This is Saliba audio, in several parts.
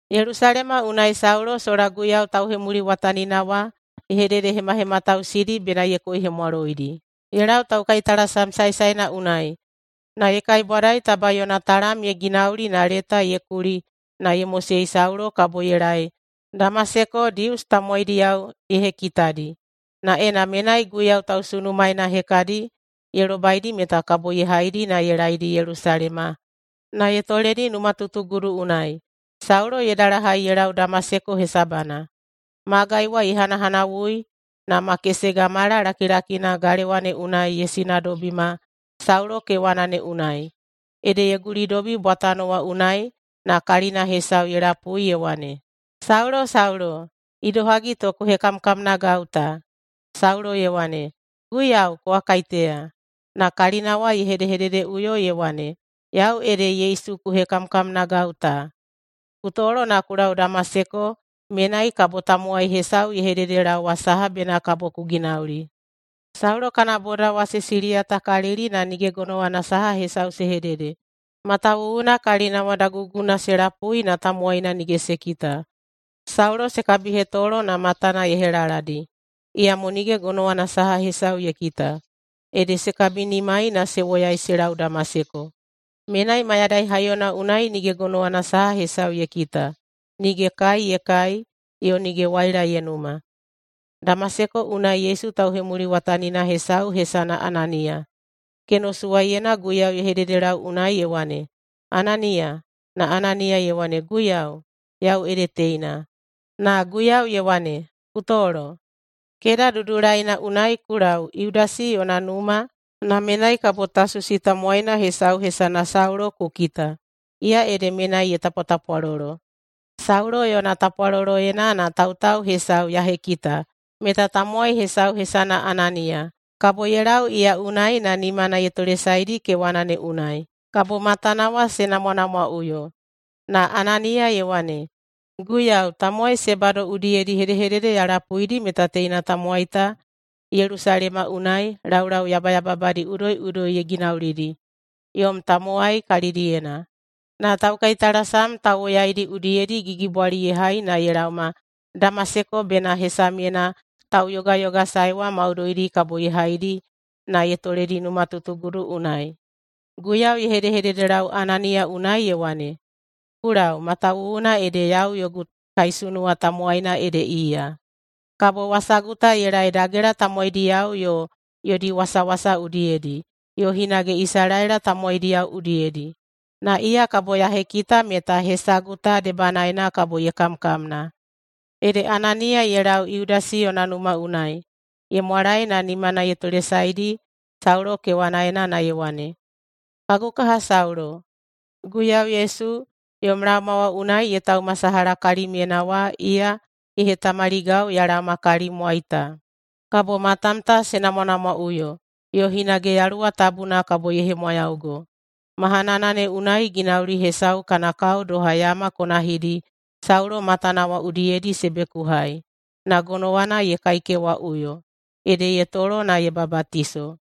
Yelusalema unai Saulo sola Guiyau tauhemuliwatanina wa ye hededehemahematausidi bena ye koihemwaloidi. Ye lau taukaitalasam saesaena unai na ye kaibwadai taba yona talam ye ginauli na leta ye kuli na ye mosei Saulo kabo ye laei Damaseko Dius tamowaidiyao ye hekitadi, na ena menai Guiyau tausunumaena hekadi ye lobaidi meta kabo ye haidi ye laedi Yelusalema na ye toledi numatutugudu unai. Saulo ye dalahai ye lau Damaseko hesabana. Magai wa ye hanahanawui, na makesega mala lakilakina galewa ne unai ye sinadobima Saulo kewana ne unai. Ede ye gulidobi bwatano wa unai na kalina hesau ye lapui ye wane, “Saulo! Saulo! Idohagi to ku hekamkamnagau ta?” Saulo ye wane, “Guiyau, kowa kaiteya?” Na kalina wa ye hedehededeꞌuyo ye wane, “Yau ede Yesu ku hekamkamnagau ta. Ku tolo na ku lau Damaseko, menai kabo tamowai hesau ye hededelaowa saha bena kabo ku ginauli.” Saulo kana bodao wa se siliyatakalili na nige gonowana saha hesau se hedede, matawuwuna kalina wa daguguna se lapui na tamowaina nige se kita. Saulo se kabihetolo na matana ye helaladi, iyamo nige gonowana saha hesau ye kita. Ede se kabinimai na se woyai se lau Damaseko. Menai mayadai haiyona unai nige gonowana saha hesau ye kita, nige kai ye kai, yo nige waila ye numa. Damaseko unai Yesu tauhemuliwatanina hesau hesana Ananiya. Kenosuwaiyena Guiyau ye hedehededelau unai ye wane, “Ananiya!” Na Ananiya ye wane, “Guiyau, yau ede teina.” Na Guiyau ye wane, “Ku tolo! Keda Dudulaina unai ku lau Yudasi yona numa, na menai kabo Tasusi tamowaina hesau hesana Saulo ku kita. Iya ede menai ye tapwatapwalolo. Saulo yona tapwaloloyena na tautau hesau ya hekita meta tamowai hesau hesana Ananiya kabo ye lau iya unai na nimana ye tolesaedi kewana ne unai, kabo matana wa se namwanamwaꞌuyo.” Na Ananiya ye wane, “Guiyau, tamowai se bado udiyedi hedehedede ya lapuidi meta teina tamowai ta Yelusalema unai laulau yabayababadi udoiꞌudoi ye ginaulidi yom tamowai kalidiyena. Na taukaitalasam tauwoyaidi udiyedi gigibwali ye hai na ye laoma Damaseko bena hesamyena tauyogayogasaewa maudoidi kabo ye haidi na ye toledi numatutugudu unai.” Guiyau ye hedehededelau Ananiya unai ye wane, “Ku lau, matawuwuna ede yau yogu kaisunuwa tamowaina ede iya, kabo wasagu ta ye laei dagela tamowaidiyao yo yodi wasawasa udiyedi, yo hinage Isalaela tamowaidiyao udiyedi. Na iya kabo ya hekita meta hesagu ta debanaena kabo ye kamkamna.” Ede Ananiya ye lau Yudasi yona numa unai ye mwalae na nimana ye tolesaedi Saulo kewanaena na ye wane, “Kagu kaha Saulo! Guiyau Yesu, yom laoma wa unai ye taumasalaha kalimyena wa, iya ye hetamaligau ya laoma kalimwai ta, kabo matam ta se namwanamwaꞌuyo yo hinage Yaluwa Tabuna kabo ye hemwayaugo.” Mahanana ne unai ginauli hesau kana kao doha yama konahidi Saulo matana wa udiyedi se bekuhai, na gonowana ye kaikewaꞌuyo. Ede ye tolo na ye babatiso.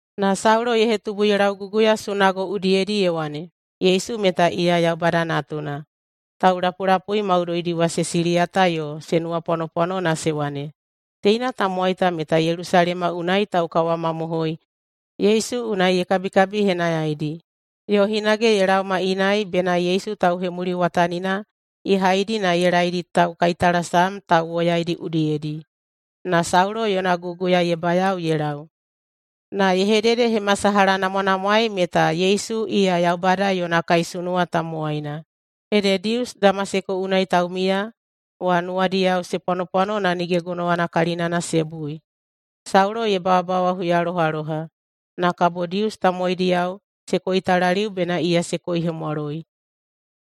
na Saulo ye hetubu ye lauguguya sunago udiyedi ye wane, “Yesu meta iya Yaubada Natuna.” Taulapulapui maudoidi wa se siliyata yo se nuwapwanopwano na se wane, “Teina tamowai ta meta Yelusalema unai taukawamamohoi Yesu unai ye kabikabihenayaidi, yo hinage ye laoma inai bena Yesu tauhemuliwatanina ye haidi na ye laedi taukaitalasam tauwoyaidi udiyedi.” Na Saulo yona guguya ye bayao ye lau, na ye hededehemasalahanamwanamwaei meta Yesu iya Yaubada yona kaisunuwa tamowaina. Ede Dius Damaseko unai taumiya wa nuwadiyao se pwanopwano na nige gonowana kalinana se bui. Saulo ye babawa huyalohaloha, na kabo Dius tamowaidiyao se koitalaliu bena iya se koihemwaloi.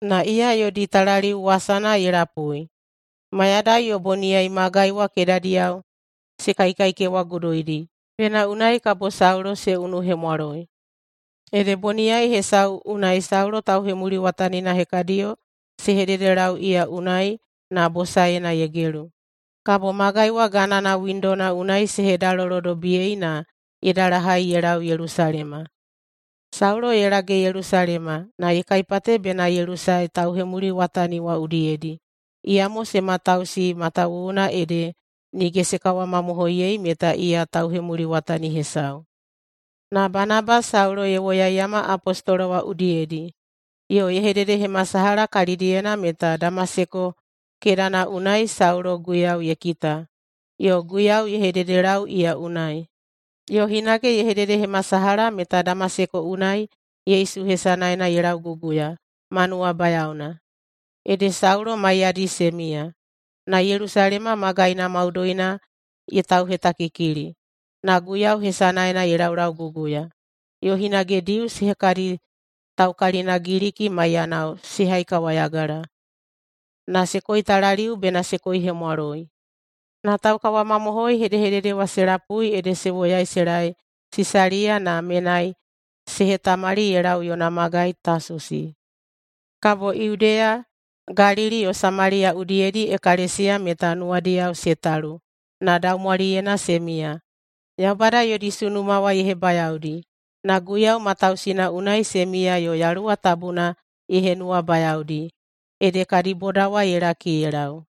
Na iya yodi talaliu wasana ye lapui. Mayadai yo boniyai magai wa kedadiyao se kaikaikewaguduidi bena unai kabo Saulo se unuhemwaloi. Ede boniyai hesau unai Saulo tauhemuliwatanina hekadiyo se hededelau iya unai na bosaena ye gelu. Kabo magai wa ganana windona unai se hedalolodobiyei na ye dalahai ye lau Yelusalema. Saulo ye lage Yelusalema na ye kaipate bena ye lusae tauhemuliwatani wa udiyedi, iyamo se matausei matawuwuna ede nige se kawamamohoiyei meta iya tauhemuliwatani hesau. Na Banaba Saulo ye woyaiyama apostolo wa udiyedi yo ye hededehemasalaha kalidiyena meta Damaseko kedana unai Saulo Guiyau ye kita yo Guiyau ye hededelau iya unai. Yo hinage ye hededehemasalaha meta Damaseko unai Yesu hesanaena ye lauguguya ma nuwabayaona. Ede Saulo maiyadi se miya. Na Yelusalema magaina maudoina ye tauhetakikili, na Guiyau hesanaena ye laulauguguya. Yo hinage Dius hekadi taukalina Giliki maiyanao se haikawayagala. Na se koitalaliu bena se koihemwaloi. Na taukawamamohoi hedehedede wa se lapui ede se woyai se laei Sisaliya na menai se hetamali ye lau yona magai Tasusi. Kabo Yudeya, Galili yo Samaliya udiyedi ekalesiya meta nuwadiyao se talu na daumwaliyena se miya. Yaubada yodi sunuma wa ye hebayaodi. Na Guiyau matausina unai se miya yo Yaluwa Tabuna ye henuwabayaodi, ede kadi boda wa ye laki ye lau.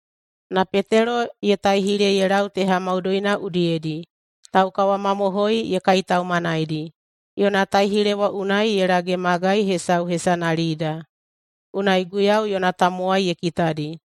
Na Petelo ye taihile ye lau teha maudoina udiyedi taukawamamohoi ye kaitaumanaidi. Yona taihile wa unai ye lage magai hesau hesana Lida, unai Guiyau yona tamowai ye kitadi.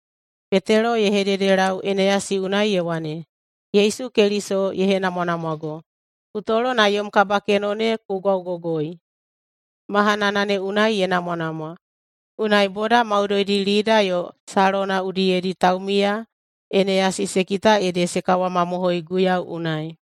Petelo ye hededelau Eneyasi unai ye wane, “Yesu Keliso ye henamwanamwago. Ku tolo na yom kabakeno ne ku gwaugogoi.” Mahanana ne unai ye namwanamwa. Unai boda maudoidi Lida yo Salona udiyedi taumiya Eneyasi se kita ede se kawamamohoi Guiyau unai.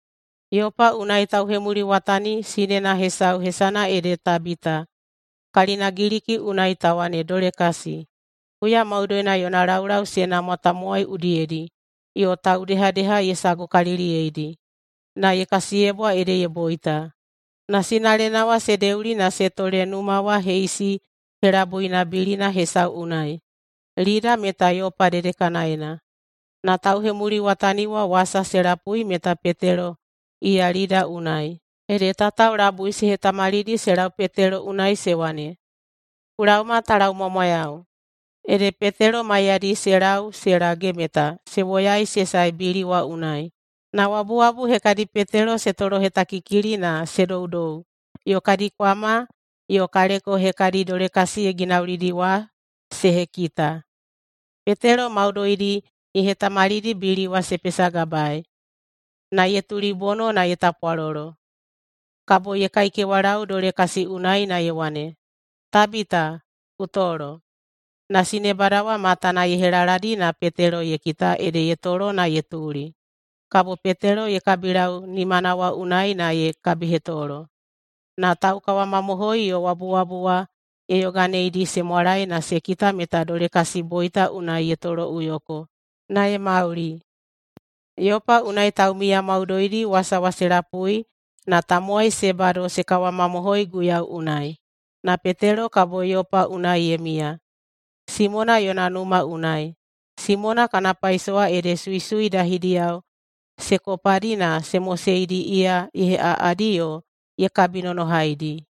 Yopa unai tauhemuliwatani sinena hesau hesana ede Tabita (kalina Giliki unai ta wane Dolekasi). Huya maudoina yona laulau se namwa tamowai udiyedi yo taudehadeha ye sagukaliliyeidi. Na ye kasiyebwa ede ye boita. Na sinalena wa se deuli na se tole numa wa heisi helabuina bilina hesau unai. Lida meta Yopa dedekanaena. Na tauhemuliwatani wa wasa se lapui meta Petelo iya Lida unai, ede tatao labui se hetamalidi se lau Petelo unai se wane, “Ku laoma ta laumwamwayau!” Ede Petelo maiyadi se lau se lage meta se woyaei se sae bili wa unai. Na wabuwabu hekadi Petelo se tolohetakikili na se doudou yo kadi kwama yo kaleko hekadi Dolekasi ye ginaulidi wa se hekita. Petelo maudoidi ye hetamalidi bili wa se pesagabaei, na ye tulibono na ye tapwalolo. Kabo ye kaikewalau Dolekasi unai na ye wane, “Tabita, ku tolo!”, na sinebada wa matana ye helaladi na Petelo ye kita ede ye tolo na ye tuli. Kabo Petelo ye kabilau nimana wa unai na ye kabihetolo, na taukawamamohoi yo wabuwabu wa ye yoganeidi se mwalae na se kita meta Dolekasi boita unai ye toloꞌuyoko na ye mauli. Yopa unai taumiya maudoidi wasa wa se lapui na tamowai se bado se kawamamohoi Guiyau unai. Na Petelo kabo Yopa unai ye miya, Simona yona numa unai. Simona kana paisowa ede suisui dahidiyao se kopadi na se moseidi iya ye heꞌaꞌadi yo ye kabinonohaidi.